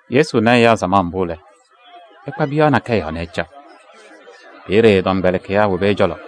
Yesu na ɛyaa samaɣ mbʋ lɛ, ɛkpa piyaɣ nakɛyɛ yɔɔ nɛ ɛcaɣ. Peeye ɛ-tɔmkpɛlɩkɩyaa wobi ɛ-cɔlɔ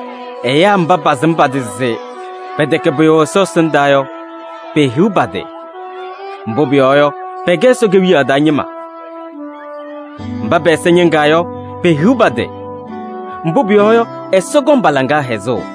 “Ɛyaa mba pasɩm pa-tɩ se pɛtɛkɛ pʋyʋ Ɛsɔ ɛsɩndaa yɔ, pehiɣ pa-tɩ! Mbʋ pʋyɔɔ yɔ, pɛkɛ Ɛsɔ Kewiyaɣ taa ñɩma. Mba pɛ-ɛza ñɩŋaa yɔ, pehiɣ pa-tɩ! Mbʋ pʋyɔɔ yɔ, Ɛsɔ kɔŋ pa-laŋa hɛzʋʋ.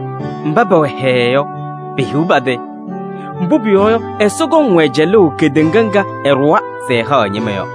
Mba pɛwɛ hɛɛɛ yɔ, pehiɣ pa-tɩ! Mbʋ pʋyɔɔ yɔ, Ɛsɔ kɔŋ-wɛ cɛlʋʋ kedeŋa ŋga ɛɖʋwa se ɛhaɣ ɛ-ñɩma yɔ.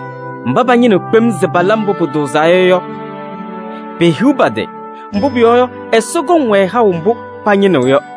Mba pañɩnɩɣ kpem se pala mbʋ pʋtʋʋzaa yɔ, pehiɣ pa-tɩ! Mbʋ pʋyɔɔ yɔ, Ɛsɔ kɔŋ-wɛ haʋ mbʋ pañɩnɩɣ yɔ.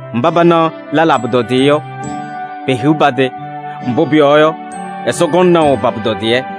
Mba panaɣ lɛlaa pʋtɔdɩyɛ yɔ, pehiɣ pa-tɩ! Mbʋ pʋyɔɔ yɔ, Ɛsɔ kɔŋ naʋ pa-pʋtɔdɩyɛ.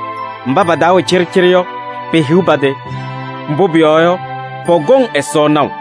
Mba pa-taa wɛ cɩɖɩcɩɖɩ yɔ, pehiɣ pa-tɩ! Mbʋ pʋyɔɔ yɔ, pɔkɔŋ Ɛsɔ naʋ.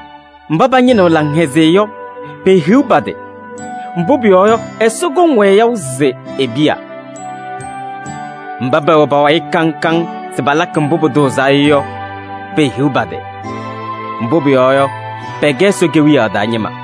Mba pañɩnɩɣ laŋhɛzɩyɛ yɔ, pehiɣ pa-tɩ! Mbʋ pʋyɔɔ yɔ, Ɛsɔ kɔŋ-wɛ yaʋ se e-piya. Mba pɛwɛ pa-wayɩ kaŋ kaŋ se palakɩ mbʋ pʋtʋʋzaa yɔ, pehiɣ pa-tɩ! Mbʋ pʋyɔɔ yɔ, pɛkɛ Ɛsɔ Kewiyaɣ taa ñɩma.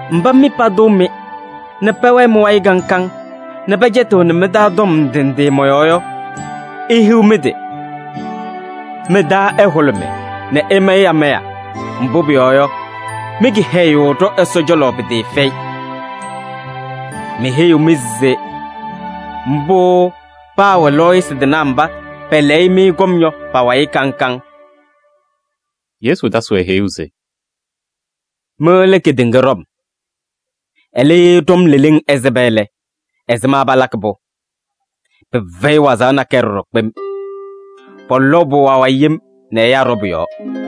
“Mba mɩ patʋʋ-mɩ nɛ pɛwɛɛ mɩ-wayɩ kaŋ kaŋ nɛ pɛcɛtɩɣnɩ mɩ-taa tɔm ndɩ ndɩ mɔ-yɔɔ yɔ, ihiɣ mɩ-tɩ! Mɩ-taa ɛhʋlʋmɩ nɛ ɩmayɩ amaya, mbʋ pʋyɔɔ yɔ, mɩ-kɩhɛyʋʋ ɖɔ Ɛsɔ cɔlɔ pɩtɩɩfɛyɩ. Meheyiɣ-mɩ se mbʋ paawɛ lɔɔyɩsɩ tɩnaa mba pɛlɛyɩ-mɩ kɔm yɔ pa-wayɩ kaŋ kaŋ.” Yesu tasɩ-wɛ heyuu se: “Mɩ lɛ kedeŋa ɖɔm. Ɛlɛ, ye ɖɔm leleŋ ɛsɩba lɛ, ɛzɩma palakɩ-pʋ? Pɩfɛyɩ wazaɣ nakɛyɛ ɖɔɖɔ kpem. Pɔlɔʋ-pʋ awayɩ yem nɛ ɛyaa ɖɔ pʋ-yɔɔ.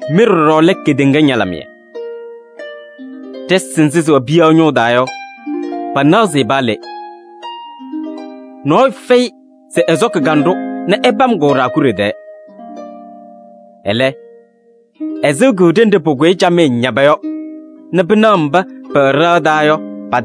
“Mɩ ɖɔɖɔ lɛ kedeŋa ñalɩmɩyɛ. Ɖɩsɩ nzɩ sɩwɛ piyaɣ ñʋʋ taa yɔ, panaɣ-sɩ paa le. Nɔɔyʋ fɛyɩ se ɛsɔkɩ kanɖʋ nɛ ɛpam-kʋ ɖaakuɖe tɛɛ. Ɛlɛ, ɛsɩɣ-kʋ ɖenɖe pʋkʋyɩ camɩyɛ ñaba yɔ nɛ pɩnaɣ mba patɩŋa payɩ pɛwɛ ɖɩɣa taa yɔ.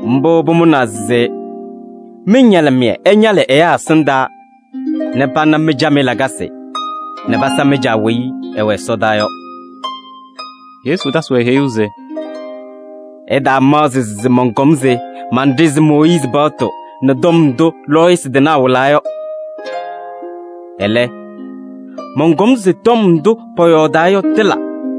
Mbʋ pʋmʋnaa se mɩ-ñalɩmɩyɛ ɛñalɩ ɛyaa ɛsɩndaa nɛ pana mɩ-camɩyɛ lakasɩ nɛ pasa mɩ-Caa weyi ɛwɛ ɛsɔdaa yɔ.” Yesu tasɩ-wɛ heyuu se: “Ɩtaamaɣzɩ se mɔnkɔm se menɖezi Mooyiizi paɣtʋ nɛ tɔm ndʋ lɔɔyɩsɩ tɩnaa wɩlaa yɔ. Ɛlɛ, mɔnkɔm se tɔm ndʋ pɔyɔɔdaa yɔ tɩla.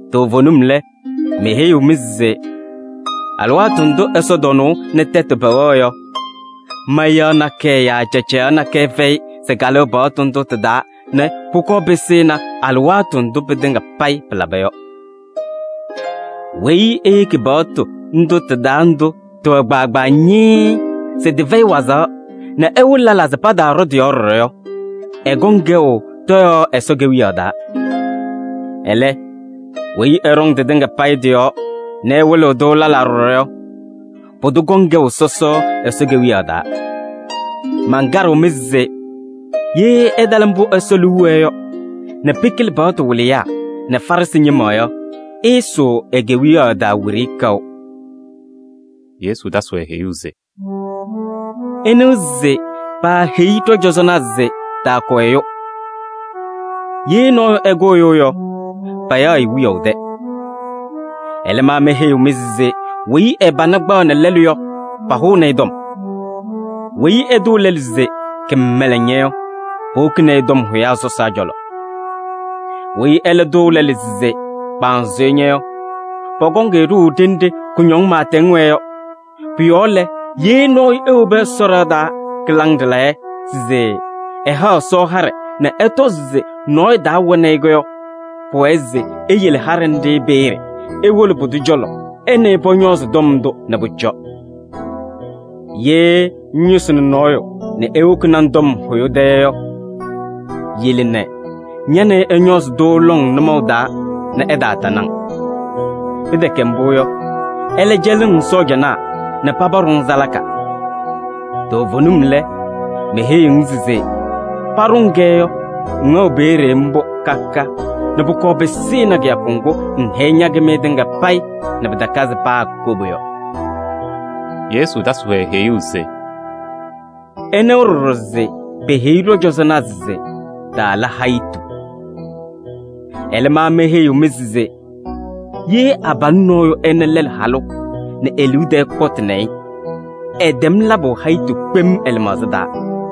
Toovenim lɛ, meheyiɣ-mɩ se alɩwaatʋ ndʋ ɛsɔtɔnʋʋ nɛ tɛtʋ pɛwɛɣ yɔ, mayaɣ nakɛyɛ yaa cacayaɣ nakɛyɛ fɛyɩ se kalɩɣ paɣtʋ ndʋ tɩ-taa nɛ pʋkɔɔ pɩsɩnɩ alɩwaatʋ ndʋ pɩtɩŋa payɩ pɩlaba yɔ. Weyi eyeki paɣtʋ ndʋ tɩ-taa ndʋ tɩwɛ kpaagbaa ñɩɩɩ yɔ se tɩfɛyɩ wazaɣ nɛ ɛwɩlɩ lɛlaa se pataaɖɔ tɩ-yɔɔ ɖɔɖɔ yɔ, ɛkɔŋ kɛʋ tɔyaɣ Ɛsɔ Kewiyaɣ taa. Ɛlɛ, weyi ɛɖɔŋ tɩtɩŋa payɩ tɩ-yɔɔ nɛ ɛwɩlɩɣ-tʋ lɛlaa ɖɔɖɔ yɔ, pʋdʋ kɔŋ kɛʋ sɔsɔ Ɛsɔ Kewiyaɣ taa. Mankaɖɩɣ-mɩ se ye ɩtala mbʋ Ɛsɔ liu wɛɛ yɔ nɛ pɩkɩlɩ paɣtʋ wɩlɩyaa nɛ Farɩsɩ ñɩma yɔ, ɩɩsʋʋ e-Kewiyaɣ taa wiɖiyi kaʋ.” Yesu tasɩ-wɛ heyuu se: “Ɩnɩwa se paaheyi ɖɔ-cɔzɔnaa se: ‘Taakʋ ɛyʋ. Ye nɔɔyʋ ɛkʋ ɛyʋ yɔ, payaɣ-ɩ wiyaʋ tɛ.’ Ɛlɛ, ma meheyiɣ-mɩ se weyi ɛ-pana kpaɣnɩ lɛlʋ yɔ, pahʋʋnɩ-ɩ. Weyi ɛtʋʋ lɛlʋ se: ‘Kɩmɛlɛŋ ña!’ Yɔ, powokini-i tɔm hʋyaa sɔsaa cɔlɔ. Weyi ɛlɛ tʋʋ lɛlʋ se: ‘Kpanzʋyʋ ña!’ Yɔ, pɔkɔŋ-ɩ ɖʋʋ ɖenɖe kʋñɔŋ pɩɩtɛŋ wɛɛ yɔ. Pʋ-yɔɔ lɛ, ye nɔɔyʋ ewobi Ɛsɔ ɖɩɣa taa kɩlaŋ ɖɩlayɛ se ɛhaɣ Ɛsɔ haɖɛ nɛ ɛtɔzɩ se nɔɔyʋ taa wɛnɩ-ɩ yɔ, pʋwɛɛ se eyele haɖɛ nɖɩ peeye nɛ ewolo pʋdʋ cɔlɔ nɛ ɛ nɛ ɩ pɔñɔɔzɩ tɔm ndʋ nɛ pʋcɔ. “Ye ŋyʋsɩnɩ nɔɔyʋ nɛ ewokini-ŋ tɔm hʋyʋ tɛ yɔ, yele nɛ ña nɛ ɩ ɩñɔɔzɩ-tʋ lɔŋ nʋmɔʋ taa nɛ ɛtaatanɩ-ŋ. Pɩtɛkɛ mbʋ yɔ, ɛlɛ cɛlɩɣ-ŋ sɔɔjanaa nɛ paba ɖʋ-ŋ salaka. Toovenim lɛ, meheyiɣ-ŋ se: paɖʋ-ŋ-kɛ yɔ, ŋwɛɣ peeye mbʋ ka ka nɛ pʋkɔɔ pɩsɩnɩ kɩyakʋ ŋgʋ ŋhɛyɩ ña-kɩmɩyɛ tɩŋa payɩ nɛ pɩtakazɩ paa koba yɔ.” Yesu tasɩ-wɛ heyuu se: “Ɩnɩwa ɖɔɖɔ se peheyi ɖɔ-cɔzɔnaa se: ‘Taala hayitu.’ Ɛlɛ, ma meheyiɣ-mɩ se: ye abalʋ nɔɔyʋ ɛna lɛlʋ halʋ nɛ e-liu tɛɛ kɔtɩ yɔ, ɛtɛm labʋ hayitu kpem ɛ-lɩmaɣza taa.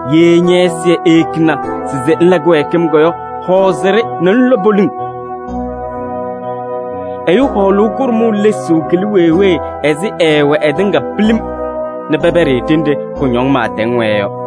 Ye ñɛ-ɛzɩyɛ eyekina se ŋla kɩwɛɛkɩm yɔ, hɔɔzɩ-ɖɩ nɛ ŋlɔ poliŋ. Ɛyʋ hɔɔlʋʋ kʋɖʋmʋʋ lesuu kɩlɩ wee wee ɛzɩ ɛɛwɛɛ ɛtɩŋa pilim nɛ pɛpɛɖɩ-ɩ ɖenɖe kʋñɔŋ pɩɩtɛŋ wɛɛ yɔ.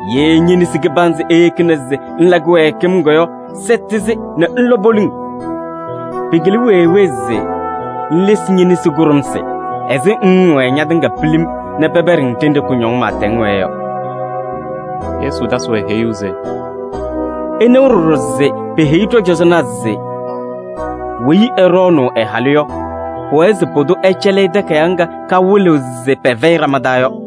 Ye ñe-nesi kɩbanzɩ eyekina se ŋla kɩwɛɛkɩm yɔ, sɛtɩ-sɩ nɛ ŋlɔ poliŋ. Pɩkɩlɩ wee wee se ŋlesi ñe-nesi kʋɖʋmsɩ ɛzɩ ŋŋwɛɛ ñatɩŋa pilim nɛ pɛpɛɖɩ-ŋ ɖenɖe kʋñɔŋ pɩɩtɛŋ wɛɛ yɔ.” Yesu tasɩ-wɛ heyuu se: “Ɩnɩwa ɖɔɖɔ se peheyi ɖɔ-cɔzɔnaa se: ‘Weyi ɛɖɔɔnʋʋ ɛ-halʋ yɔ, pʋwɛɛ se pʋdʋ ɛcɛlɩ-ɩ takayaɣ ŋga kawɩlɩɣ se pɛfɛyɩ ɖama taa yɔ.’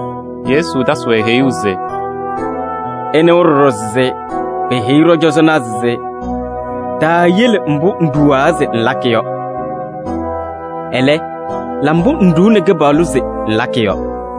Yesu tasɩ-wɛ heyuu se: “Ɩnɩwa ɖɔɖɔ se peheyi ɖɔ-cɔzɔnaa se: ‘Taayele mbʋ ŋɖuwa se ŋlakɩ yɔ. Ɛlɛ, la mbʋ ŋɖuuni Kɩpaɣlʋ se ŋlakɩ yɔ.’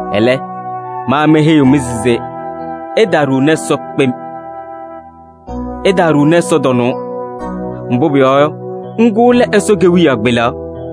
Ɛlɛ, ma meheyiɣ-mɩ se: ɩtaaɖuuni Ɛsɔ kpem: ɩtaaɖuuni ɛsɔtɔnʋʋ, mbʋ pʋyɔɔ yɔ, ŋgʋ lɛ Ɛsɔ kewiyaɣ kpelaɣ.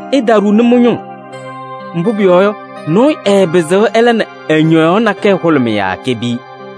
Ɩtaaɖuuni mɩ-ñʋŋ, mbʋ pʋyɔɔ yɔ, nɔɔyʋ ɛɛpɩzɩɣ ɛla nɛ ɛ-ñɔyaɣ nakɛyɛ hʋlʋmɩ yaa kepiyi.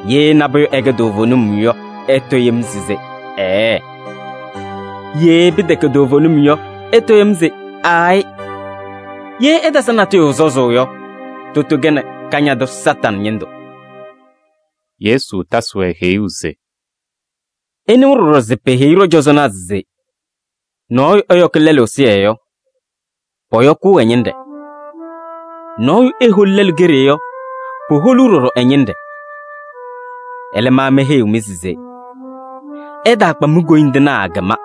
Ye nabʋyʋ ɛkɛ toovenim yɔ, ɩtɔ yem se: ‘Ɛɛɛ!’ Ye pɩtɛkɛ toovenim yɔ, ɩtɔ yem se: ‘Aayɩ!’ Ye ɩtasɩ natʋyʋ sɔzʋʋ yɔ, tʋtʋ kɛnɩ Kañadʋ Satanɩ ñɩndʋ.” Yesu tasɩ-wɛ heyuu se: “Ɩnɩwa ɖɔɖɔ se peheyi ɖɔ-cɔzɔnaa se: ‘Nɔɔyʋ ɛyɔkɩ lɛlʋ ɛzɩyɛ yɔ, pɔyɔkʋʋ ɛ-ñɩnɖɛ. Nɔɔyʋ eholi lɛlʋ keɖe yɔ, poholuu ɖɔɖɔ ɛ-ñɩnɖɛ.’ Ɛlɛ, ma meheyiɣ-mɩ se: ɩtaakpa mi-koyindinaa kɩma.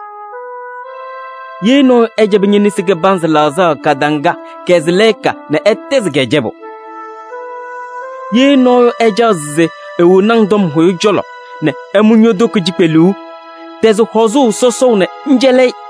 Ye nɔɔyʋ ɛcɛbɩ ñe-nesi kɩbanzɩ laɣzaɣ kadaŋa yɔ, kɛzɩ lɛɛka nɛ ɛtɛzɩ-kɛ cɛbʋ. Ye nɔɔyʋ ɛcaɣ se ewoni-ŋ tɔm hʋyʋ cɔlɔ nɛ ɛmʋ ño-toko cikpeluu yɔ, tɛzɩ hɔzʋʋ sɔsɔʋ nɛ ŋcɛlɩ-ɩ.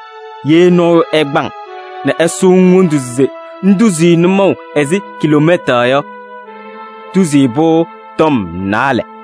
Ye nɔɔyʋ ɛkpa-ŋ nɛ ɛsʋʋ-ŋ wondu se ŋtuzi-i nʋmɔʋ ɛzɩ kiloomɛta yɔ, tuzi-i pʋ-tɔm naalɛ.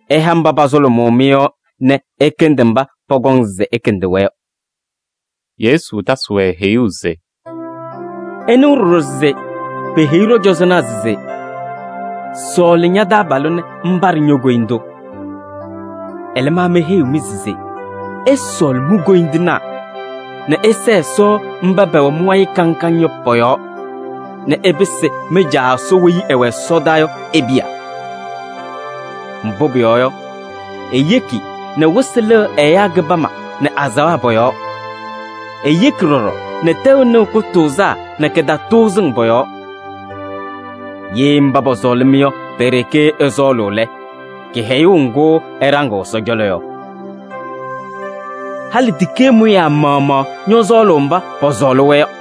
Ɩha mba pasʋlʋmʋʋ-mɩ yɔ nɛ ɩkɩndɩ mba pɔkɔŋ se ɩkɩndɩ-wɛ yɔ.” Yesu tasɩ-wɛ heyuu se: “Ɩnɩwa ɖɔɖɔ peheyi ɖɔ-cɔzɔnaa se: ‘Sɔɔlɩ ña-taabalʋ nɛ ŋpaɖɩ ño-koyindu.’ Ɛlɛ, ma meheyiɣ-mɩ se: ɩsɔɔlɩ mi-koyindinaa nɛ ɩsɛɛ Ɛsɔ mba pɛwɛ mɩ-wayɩ kaŋ kaŋ yɔ pɔ-yɔɔ nɛ ɩpɩsɩ mɩ-Caa Ɛsɔ weyi ɛwɛ ɛsɔdaa yɔ e-piya. Mbʋ pʋyɔɔ yɔ, eyeki nɛ wɩsɩ lɩɣ ɛyaa kɩbama nɛ azaɣa pɔ-yɔɔ. Eyeki ɖɔɖɔ nɛ tɛʋ nɩɣ kʋtʋʋzaa nɛ kɩtatʋʋzɩŋ pɔ-yɔɔ. Ye mba pɔsɔɔlɩ-mɩ yɔ pe-ɖeke ɩsɔɔlʋʋ lɛ, kɩhɛyʋʋ ŋgʋ ɩɖaŋɩɣ Ɛsɔ cɔlɔ yɔ? Halɩ tikee mʋyaa maɣmaɣ ñɔsɔɔlʋʋ mba pɔsɔɔlɩ-wɛ yɔ.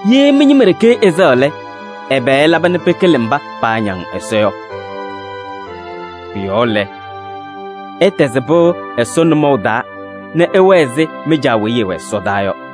Ye mɩ-ñɩma ɖeke ɩsɛɣ lɛ, ɛbɛ ɩlaba nɛ pɩkɩlɩ mba paañaŋ Ɛsɔ yɔ? Pʋ-yɔɔ lɛ, ɩtɛzɩ pɩʋ Ɛsɔ nʋmɔʋ taa nɛ ɩwɛɛ ɛzɩ mɩ-Caa weyi ɛwɛ ɛsɔdaa yɔ.”